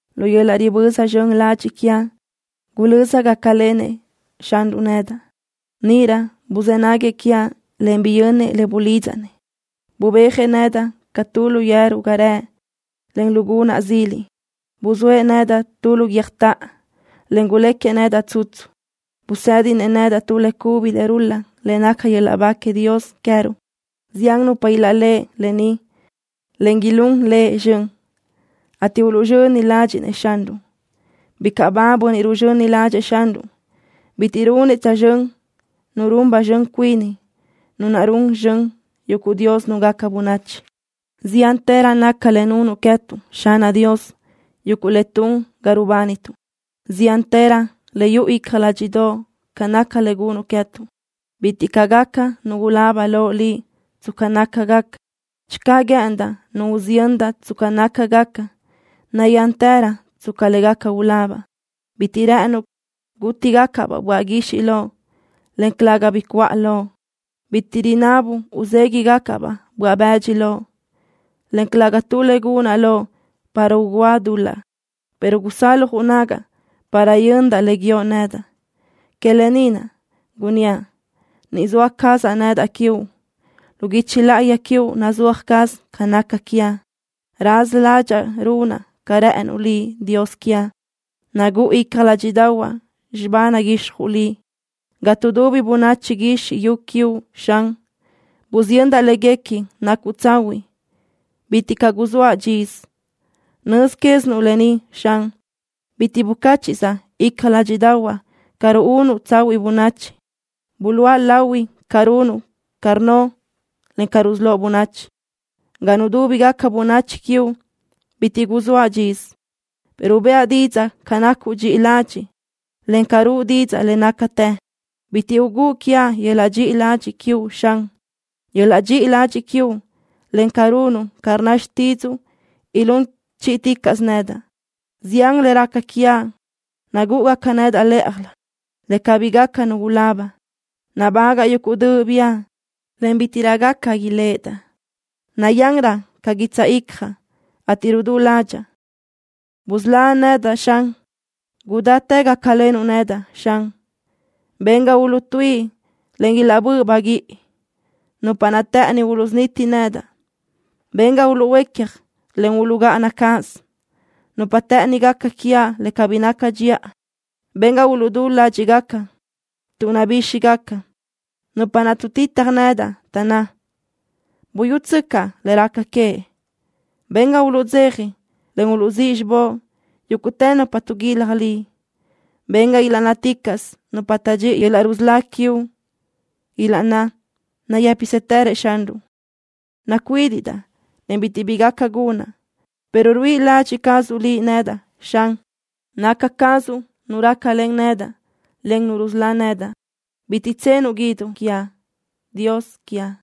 Lu yöl-laʼ riböza zxön ladxiʼ quiaʼ gulözaʼ gácalenëʼ Xanruʼ nedaʼ. Níʼirö buzë́ naguëʼ quiaʼ, en biyönnëʼ le bulidzaʼ-nëʼ. Bubéajëʼ nedaʼ ca tu lu yeru ga rëʼ, en lu gunaʼ zili. Buzóëʼ nedaʼ tu lu guiö́jtoʼo, en guléquiëʼ nedaʼ tsutsu. Busë́dinëʼ nedaʼ tu le cubi le rul-laʼ le naca yöl-laʼ ba queëʼ Dios queëruʼ. Zián nupa ilaʼléʼeni lë ni, en ilún Lëʼ zxön, ateʼ uluʼzxöni ladxiʼ-nëʼ Xanruʼ. Bicaʼ ba bönniʼ ruzxöni ládxëʼë Xanruʼ. Bitiʼ runëʼ tsözxö́n nu run ba zxön cuini, nu naʼ run zxön yuguʼ dios núngaca bönachi. Ziántërö naca le nunuʼ queë́tuʼ, Xanaʼ Dios, yuguʼ le tun ga rubánituʼ. Ziántërö le yuʼu icja ládxiʼdoʼo ca naca le gunuʼ queë́tuʼ. Bitiʼ caʼ gaca nu ulaba loʼ Liʼ tsca nácagaca. Channö guë́ʼëndaʼ nu usiyöndaʼ tsca nácagaca, nayántërö tsca le gaca ulabaʼ. Bitiʼ rë́ʼënuʼ gútigacaʼ-baʼ böaʼ guixiʼ loʼ, en calëga bi cuʼa loʼ. Bitiʼ rinabuʼ uzéguiʼgacaʼ-baʼ böaʼ bëdxi loʼ, en calëga tu le gunaʼ loʼ para ugúa dul-laʼ, pero gusaljuʼ nagaʼ para yöndaʼ le guíoʼ nedaʼ. Que lë ni naʼ gunníaʼ: Ni zoa cazaʼ nedaʼ quiuʼ. Lu guichi láʼayi quiuʼ nazúaj caz ca naca quiaʼ. Raza ládxaʼa runaʼ ca rë́ʼënuʼ Liʼ, Dios quiaʼ. Naguʼa icja ládxiʼdaʼahuaʼ xibá naguixjuʼ Liʼ. Ga tuʼdubi bönachi guizxi yu quiuʼ, Xan, busiyöndaʼ léguequi nacuʼ tsahuiʼ. Bitiʼ caʼ guzóaʼ dxisö. Nöz quézinuʼ lë ni, Xan. Bitiʼ bucáchiʼzaʼ icja ládxiʼdaʼahuaʼ ca ruúnuʼ tsahuiʼ bönachi. Buluʼa lahui ca runuʼ ca rnnoʼ, en ca rusölóʼ bönachi. Ga nudúbigaca bönachi quiuʼ bitiʼ guzóaʼ dxisö, pero bëʼa didzaʼ ca nacuʼ dxiʼi ladxiʼ, en ca ruʼu didzaʼ le nácatë. Bitiʼ ugúʼ quiaʼ yöl-laʼ dxiʼi ladxiʼ quiuʼ, Xan. Yöl-laʼ dxiʼi ladxiʼ quiuʼ, en ca runuʼ ca rnna xtídzuʼu ilún chíʼiticaʼsö nedaʼ. Zián le raca quiaʼ nagúʼugaca nedaʼ lë́ʼajlö, le cabí gaca nu ulaba. Nabágaʼa yuguʼ döʼ biʼa, en bítiʼrö gaca iléʼedaʼ. Nayanrö ca guitsaʼ icjaʼ, ateʼ rudú ládxaʼa. ¡Busölá nedaʼ, Xan! ¡Gudáchi gácalenuʼ nedaʼ, Xan! Ben ga uluʼtuíʼi, en ilaʼbö́ʼ baguíʼi nupa naʼ të́ʼëni uluʼsuniti nedaʼ. Ben ga uluʼhuécaj, en uluʼgáʼana cáʼasö nupa naʼ të́ʼëni gaca quiaʼ le cabí naca dxiʼa. Ben ga uluʼdú ládxiʼgaca tuʼ nabíxigaca nupa naʼ tuʼtitaj nedaʼ, taʼnná: “¡Buyútsöcaʼ le raca queëʼ!” Ben ga uluʼdzeja, en uluʼzíʼ xibóʼ yúguʼtë nupa tuʼguilaj Liʼ. Ben ga ilaʼnnáticaʼsö nupa taʼdxíʼi yöl-laʼ rusölá quiuʼ, ilaʼnná: “Nayë́psëtërëʼ Xanruʼ.” Nacuídiʼdaʼ, en bitiʼ bi gaca gunaʼ, pero ruíʼi ladxiʼ cazuʼ Liʼ nedaʼ, Xan. Naca cazuʼ Nu rácalen nedaʼ, en Nu rusölá nedaʼ. Bitiʼ tsenuʼ guíduʼ quiaʼ, Dios quiaʼ.